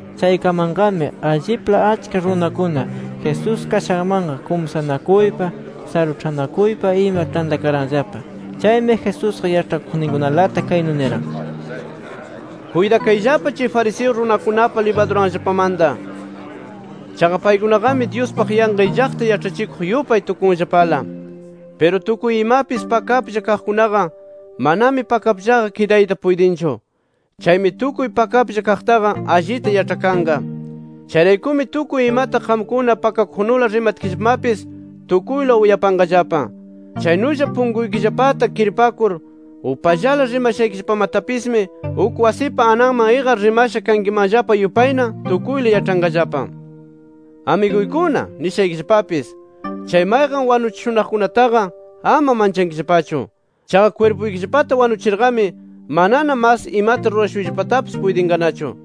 Chaykamanqami, allipla achka runakuna Jesús kashanmanqa, kumsanakuypa, saruĉhanakuypa ima tantakaranllapa. Chaymi, Jesusqa yaĉhakuqninkunalata, kaynu niran: “Kuytakayllapa chay fariseo runakunapa libaduranllapamanta. Chaqa paykunaqami Dyuspaq yanqa illaqta yaĉhachikuq yupay tukunllapala. Piru tukuy imapis pakaplla kaqkunaqa manami pakapllaqa kidayta puytinchu. Chaymi tukuy pakaplla kaqtaqa allita yaĉhakanqa. Chayraykumi tukuy imata qamkuna pakakuqnula rimatkillapamapis, tukuyla uyapanqallapa. Chaynulla punkuykillapata kirpakur upallala rimashaykillapamatapismi, uk wasipa ananman iqar rimasha kankimanllapa yupayna, tukuyla yaĉhanqallapa. “Amiguykuna nishaykillapapis: Chay mayqan wanuchishunaqkunataqa ama manchankillapachu. Chaqa kwirpuykillapata wanuchirqami manana mas imata rurashuyllapatapis puytinqanachu.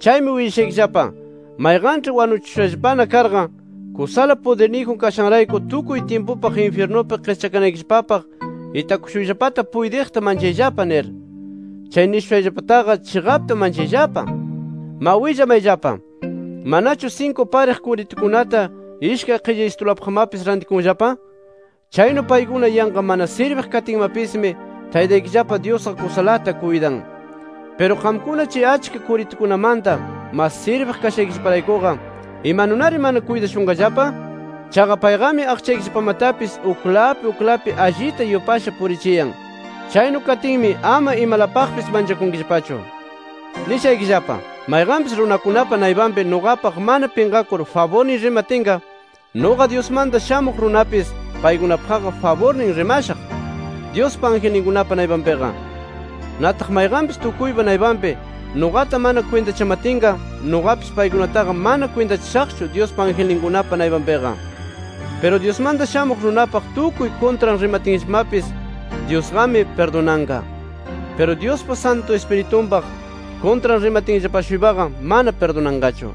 Chaymi willashaykillapa: Mayqanĉhi wanuchishushallapana karqa, kusala pudirniyjun kashanrayku tukuy tyimpupaq infyirnupi qischakanaykillapapaq itakushuyllapata puytiqta manchayllapa nir. Chay nishushayllapataqa, chiqapta manchayllapa. “Ma willamayllapa: ¿Manachu sinku pariq kuritukunata ishkay qillaysitulapaqmapis rantikunllapa? Chaynu paykuna yanqa mana sirbiq katinmapismi Taytaykillapa Dyusqa kusalata kuytan. Piru qamkuna chay achka kuritukunamanta mas sirbiq kashaykillaparaykuqa, ¿imanunari mana kuytashunqallapa? Chaqa payqami aqchaykillapamatapis uklapi uklapi allita yupasha purichiyan. Chaynu katinmi ama imalapaqpis manchakunkillapachu. “Nishaykillapa: Mayqanpis runakunapa naypanpi nuqapaq mana pinqakur faburniy rimatinqa, nuqa Dyusmanta Shamuq Runapis, paykunapaqqa faburnin rimashaq, Dyuspa angelninkunapa naypanpiqa. Nataq mayqanpis tukuypa naypanpi, nuqata mana kwintachamatinqa, nuqapis paykunataqa mana kwintachashaqchu Dyuspa angelninkunapa naypanpiqa. “Piru Dyusmanta Shamuq Runapaq tukuy kuntran rimatinllapamapis, Dyusqami pirdunanqa. Piru Dyuspa Santu Ispiritunpaq kuntran rimatinllapa-shuypaqa mana pirdunanqachu.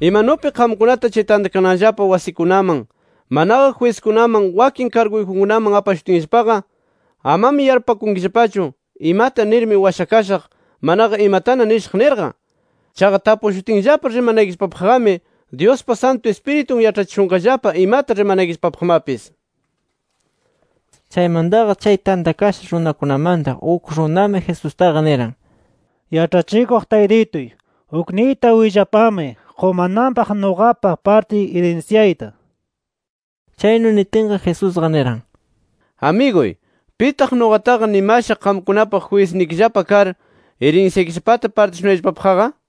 “Imanupi qamkunata chay tantakananllapa wasikunaman, manaqa jwiskunaman, wakin karguyjunkunaman apashutinllapaqa amami yarpupakunkillapachu, imata nirmi washakashaq, manaqa imatana nishaq nirqa. Chaqa tapushutinllapa rimanaykillapapaqqami Dyuspa Santu Ispiritun yaĉhachishunqallapa imata rimanaykillapapaqmapis”. Chaymantaqa, chay tantakasha runakunamanta, uk runami Jesustaqa niran: —Yaĉhachikuq Taytituy, ukniyta willapamay qumananpaq nuqapa partiy irinsyayta nir. Chaynu nitinqa, Jesusqa niran: —Amiguy, ¿pitaq nuqataqa nimasha qamkunapaq jwisnikillapa kar irinsyaykillapata partishunayllapapaqqa? nir.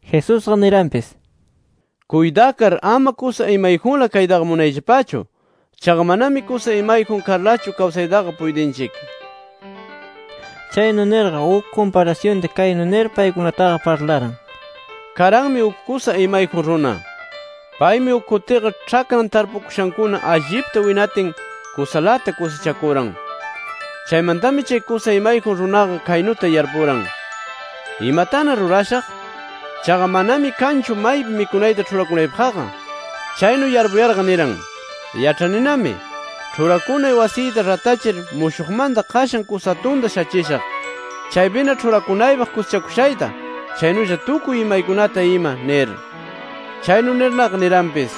Jesusqa niranpis: —Kuytakar, ama kusa imayjunla kaytaqa munayllapachu. Chaqa manami kusa imayjun karlachu, kawsaytaqa puytinchik. Chaynu nirqa, uk kumparasyunta kaynu nir paykunataqa parlaran: “Karanmi uk kusa imayjun runa. Paymi uk kutiqa ĉhakran tarpukashakuna allipta winatin kusalata kusichakuran. Chaymantami, chay kusa imayjun runaqa kaynuta yarpuran: ¿Imatana rurashaq? Chaqa manami kanchu maypi mikunayta ĉhurakunaypaqqa. Chaynu yarpuyarqa, niran: ‘Yaĉhaninami, ĉhurakunay wasiyta ratachir mushuqmanta qashan kusa atunta shachishaq, chaypina ĉhurakunaypaq kusichakushayta, chaynulla tukuy imaykunata ima’ nir. Chaynu nirnaqa, niranpis: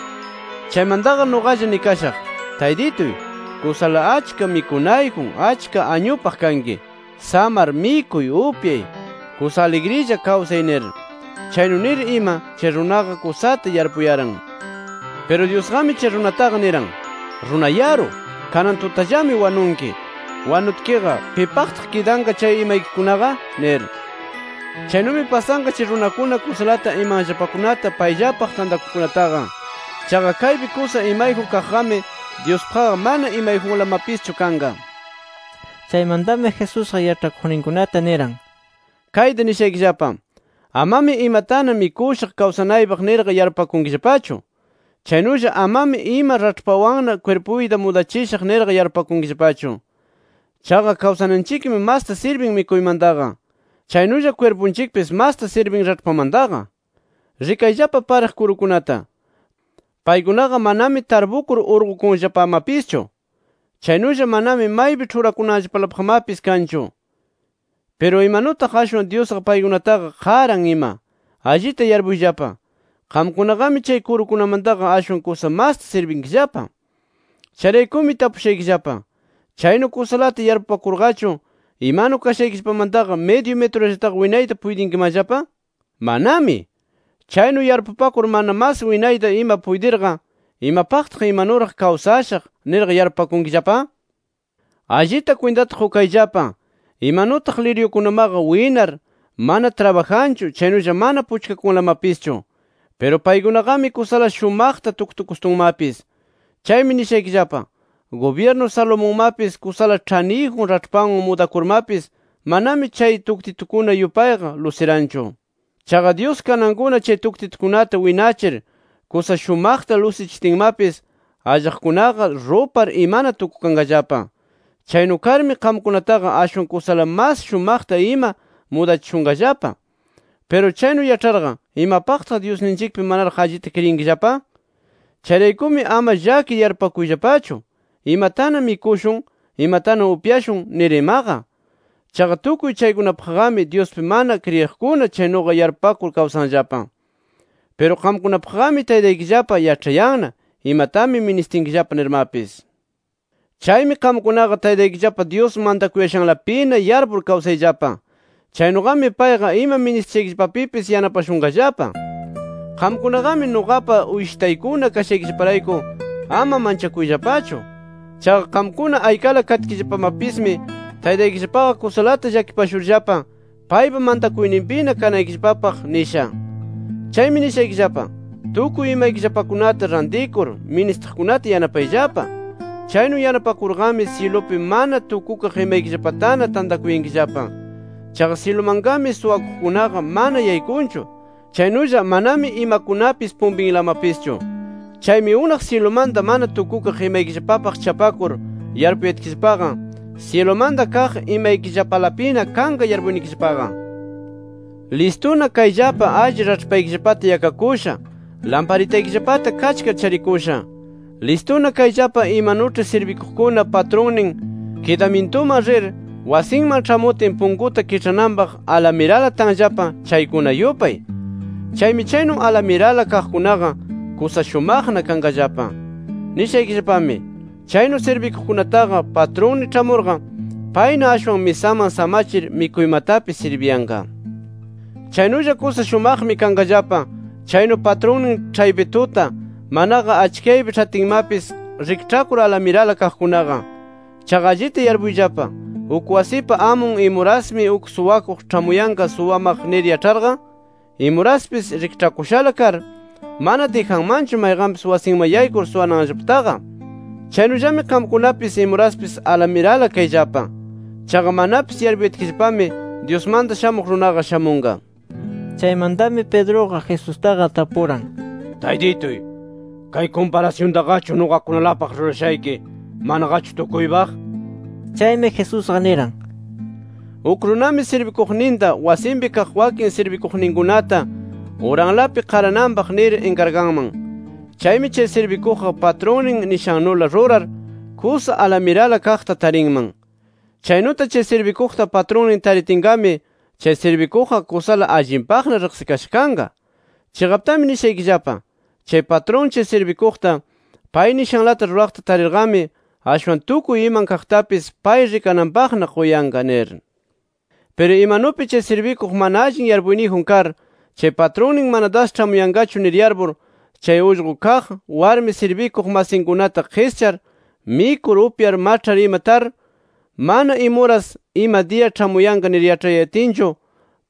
‘Chaymantaqa nuqalla nikashaq: Taytituy, kusala achka mikunayjun achka añupaq kanki. Samar mikuy, upyay, kusa aligrilla kawsay nir’. Chaynu nir ima, chay runaqa kusata yarpuyaran. “Piru Dyusqami chay runataqa niran: ‘¡Runa yaru! Kanan tutallami wanunki. Wanutkiqa, ¿pipaqtaq kidanqa chay imaykikunaqa?’ nir. “Chaynumi pasanqa chay runakuna kusalata imanllapakunata payllapaq tantakuqkunataqa. Chaqa kaypi kusa imayjun kaqqami, Dyuspaqqa mana imayjunlamapischu kanqa”. Chaymantami Jesusqa yaĉhakuqninkunata niran: “Kayta nishaykillapa: Amami imatana mikushaq kawsanaypaq nirqa yarpupakunkillapachu. Chaynulla amami ima raĉhpawanna kwirpuyta mudachishaq nirqa yarpupakunkillapachu. Chaqa kawsananchikmi masta sirbin mikuymantaqa. Chaynulla kwirpunchikpis masta sirbin raĉhpamantaqa. “Rikayllapa pariq kurukunata. Paykunaqa manami tarpukur urqukunllapamapischu. Chaynulla manami maypi ĉhurakunanllapalapaqmapis kanchu. Piru, imanutaq ashwan Dyusqa paykunataqa qaran ima. ¡Allita yarpuyllapa, qamkunaqami chay kurukunamantaqa ashwan kusa masta sirbinkillapa! “Chayraykumi tapushaykillapa: ¿Chaynu kusalata yarpupakurqachu, imanu kashaykillapamantaqa midyu mitrullataqa winayta puytinkimanllapa? ¡Manami! Chaynu yarpupakur mana mas winayta ima puytirqa, ¿imapaqtaq ‘Imanuraq kawsashaq’ nirqa yarpupakunkillapa? “Allita kwintata qukayllapa imanutaq liryukunamaqa winar, mana trabajanchu chaynulla mana puchkakunlamapischu. Piru paykunaqami kusala shumaqta tuktukustunmapis. Chaymi nishaykillapa: Gubyirnu Salomonmapis kusala ĉhaniyjun raĉhpanwan mudakurmapis manami chay tuktitukuna yupayqa lusiranchu. Chaqa Dyus kanankuna chay tuktitukunata winachir kusa shumaqta lusichitinmapis, allaqkunaqa rupar imana tukukanqallapa. Chaynu karmi qamkunataqa ashwan kusala mas shumaqta ima mudachishunqallapa. Piru chaynu yaĉharqa, ¿imapaqtaq Dyusninchikpi manaraq allita kriyinkillapa? “Chayraykumi ama llakir yarpupakuyllapachu ¿imatana mikushun? ¿imatana upyashun? nir imaqa. Chaqa tukuy chaykunapaqqami Dyuspi mana kriyiqkuna chaynuqa yarpupakur kawsanllapa. Piru qamkunapaqqami Taytaykillapa yaĉhayanna, imatami ministinkillapa nirmapis. “Chaymi qamkunaqa Taytaykillapa Dyus mantakuyashanlapina yarpur kawsayllapa. Chaynuqami payqa ima ministishaykillapapipis yanapashunqallapa. “Qamkunaqami nuqapa uyshitaykuna kashaykillaparayku ama manchakuyllapachu. Chaqa qamkuna aykala katkillapamapismi Taytaykillapaqa kusalata llakipashurllapa, paypa mantakuyninpina kanaykillapapaq nisha. Chaymi nishaykillapa: Tukuy imaykillapakunata rantikur, ministiqkunata yanapayllapa. Chaynu yanapakurqami syilupi mana tukukaq imaykillapatana tantakuyankillapa. Chaqa syilumanqami suwakuqkunaqa mana yaykunchu, chaynulla manami imakunapis pumpinlamapischu. Chaymi unaq syilumanta mana tukukaq imaykillapapaq chapakur yarpuyatkillapaqa syilumanta kaq imaykillapalapina kanqa yarpuynikillapaqa. “Listuna kayllapa alli raĉhpaykillapata yakakusha, lamparitaykillapata kachkar charikusha. Listuna kayllapa, imanuĉhi sirbikuqkuna patrunnin kidamyintuman rir, wasinman ĉhamutin punkuta kiĉhananpaq alamirala tanllapa, chaykuna yupay. Chaymi chaynu alamirala kaqkunaqa kusa shumaqna kanqallapa. Nishaykillapami: Chaynu sirbikuqkunataqa patrunnin ĉhamurqa, payna ashwan misaman samachir mikuymatapis sirbiyanqa. Chaynulla kusa shumaqmi kanqallapa, chaynu patrunnin ĉhaypi tuta, manaqa achkiyaypi ĉhatinmapis, rikĉhakur alamirala kaqkunaqa. Chaqa allita yarpuyllapa: Uk wasipa amun imurasmi uk suwakuq ĉhamuyan suwamaq nir yaĉharqa, imuraspis rikĉhakushala kar, mana dijanmanchu mayqanpis wasinman yaykur suwananllapataqa. Chaynullami qamkunapis, imuraspis alamirala kayllapa. Chaqa manapis yarpuyatkillapami, Dyusmanta Shamuq Runaqa shamunqa”. Chaymantami Pedruqa Jesusta tapuran: —Taytituy, ¿kay kumparasyuntaqachu nuqakunalapaq rurashayki, manaqachu tukuypaq? Chaymi Jesusqa niran: “Uk runami sirbikuqninta, wasinpi kaq wakin sirbikuqninkunata uranlapi qarananpaq nir inkarganman. Chaymi chay sirbikuqqa patrunnin nishannula rurar, kusa alamirala kaqta tarinman. Chaynuta chay sirbikuqta patrunnin taritinqami, chay sirbikuqqa kusala allinpaqna riqsikasha kanqa. Chiqaptami nishaykillapa: Chay patrun chay sirbikuqta pay nishanlata ruraqta tarirqami, ashwan tukuy iman kaqtapis pay rikananpaqna quyanqa nir. Piru imanupi chay sirbikuq mana allin yarpuyniyjun kar, chay patrunnin mana das ĉhamuyanqachu nir yarpur, chay ullqu kaq, warmi sirbikuq masinkunata qischar, mikur upyar maĉhar ima tar, mana imuras ima diya ĉhamuyanqa nir yaĉhayatinchu,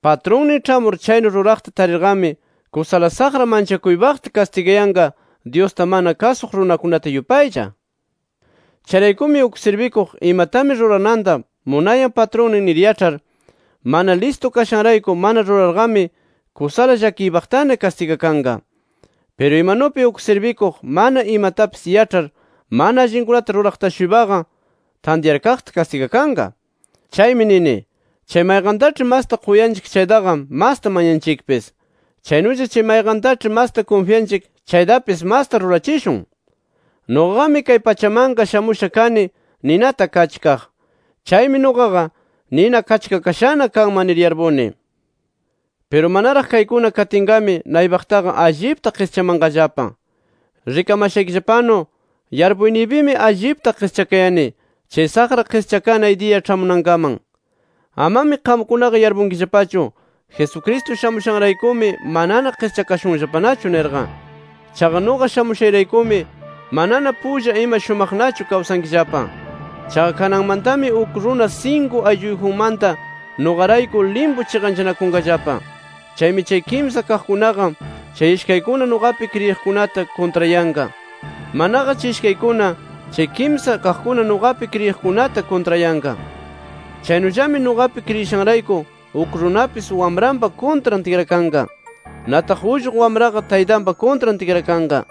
patrunnin ĉhamur chaynu ruraqta tarirqami, kusala saqra manchakuypaqta kastigayanqa Dyusta mana kasuq runakunata yupaylla. “Chayraykumi uk sirbikuq imatami rurananta munayan patrunnin nir yaĉhar, mana listu kashanrayku mana rurarqami kusala llakiypaqtana kastigakanqa. Piru imanupi, uk sirbikuq mana imatapis yaĉhar mana allinkunata ruraqta-shuypaqa tantyarkaqta kastigakanqa. Chaymi nini chay mayqantaĉhi masta quyanchik chaytaqa, masta mañanchikpis. Chaynulla chay mayqantaĉhi masta kunfyanchik, chaytapis masta rurachishun. “Nuqaqami kay pachamanqa shamusha kani ninata kachkaq. ¡Chaymi nuqaqa, nina kachkakashana kanman nir yarpuni! Piru manaraq kaykuna katinqami, naypaqtaqa allipta qischamanqallapa. ¡Rikamashaykillapanu yarpuyniypimi allipta qischakayani, chay saqra qischakanay diya ĉhamunankaman! Amami qamkunaqa yarpunkillapachu: Jesucristo shamushanraykumi manana qischakashunllapanachu nirqa. Chaqa nuqa shamushayraykumi manana pulla ima shumaqnachu kawsankillapa. Chaqa kananmantami uk runa sinku aylluyjunmanta nuqarayku limpu chiqanchanakunqallapa. Chaymi chay kimsa kaqkunaqa chay ishkaykuna nuqapi kriyiqkunata kuntrayanqa. Manaqa chay ishkaykuna chay kimsa kaqkuna nuqapi kriyishakunata kuntrayanqa. Chaynullami nuqapi kriyishanrayku, uk runapis wamranpa kuntran tikrakanqa. Nataq ullqu wamraqa taytanpa kuntran tikrakanqa.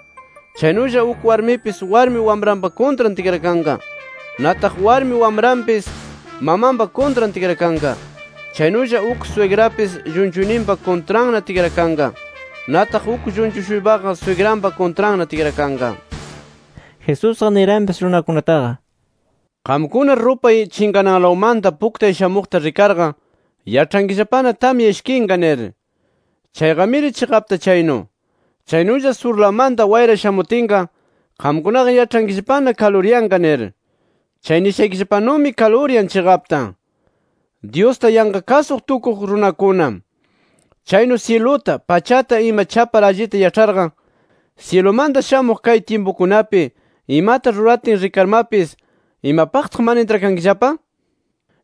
Chaynulla uk warmipis warmi wamranpa kuntran tikrakanqa. Nataq warmi wamranpis mamanpa kuntranna tikrakanqa. Chaynulla uk swigrapis llunchuyninpa kuntranna tikrakanqa. Nataq uk llunchu-shuypaqa swigranpa kuntranna tikrakanqa”. Jesusqa niranpis runakunataqa: “Qamkuna rupay chinqananlawmanta puktay shamuqta rikarqa, yaĉhankillapana tamya ishkinqa, nir. Chayqamiri chiqapta chaynu. Chaynulla surlawmanta wayra shamutinqa, qamkunaqa yaĉhankillapana kaluryanqa, nir. Chay nishaykillapanumi kaluryan chiqapta. ¡Dyusta yanqa kasuq tukuq runakuna! Chaynu syiluta, pachata ima chapar allita yaĉharqa, syilumanta shamuq kay tyimpukunapi imata ruratin rikarmapis, ¿imapaqtaq mana intrakankillapa?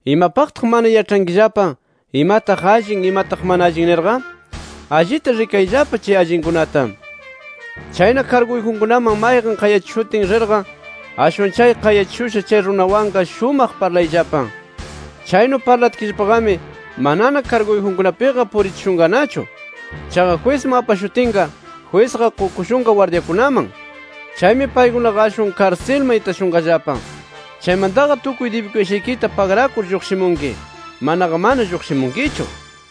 “¿Imapaqtaq mana yaĉhankillapa, imataq allin imataq mana allin nirqa? Allita rikayllapa chay allinkunata. Chayna karguyjunkunaman mayqan qayachishutin rirqa, ashwan chay qayachishusha chay runawanqa shumaq parlayllapa. Chaynu parlatkillapaqami manana karguyjunkunapiqa purichishunqanachu. Chaqa jwisman apashutinqa, jwisqa qukushunqa gwardyakunaman. Chaymi paykunaqa ashwan karsilman itashunqallapa. Chaymantaqa tukuy dibikushaykita pagrakur lluqshimunki. Manaqa mana lluqshimunkichu”.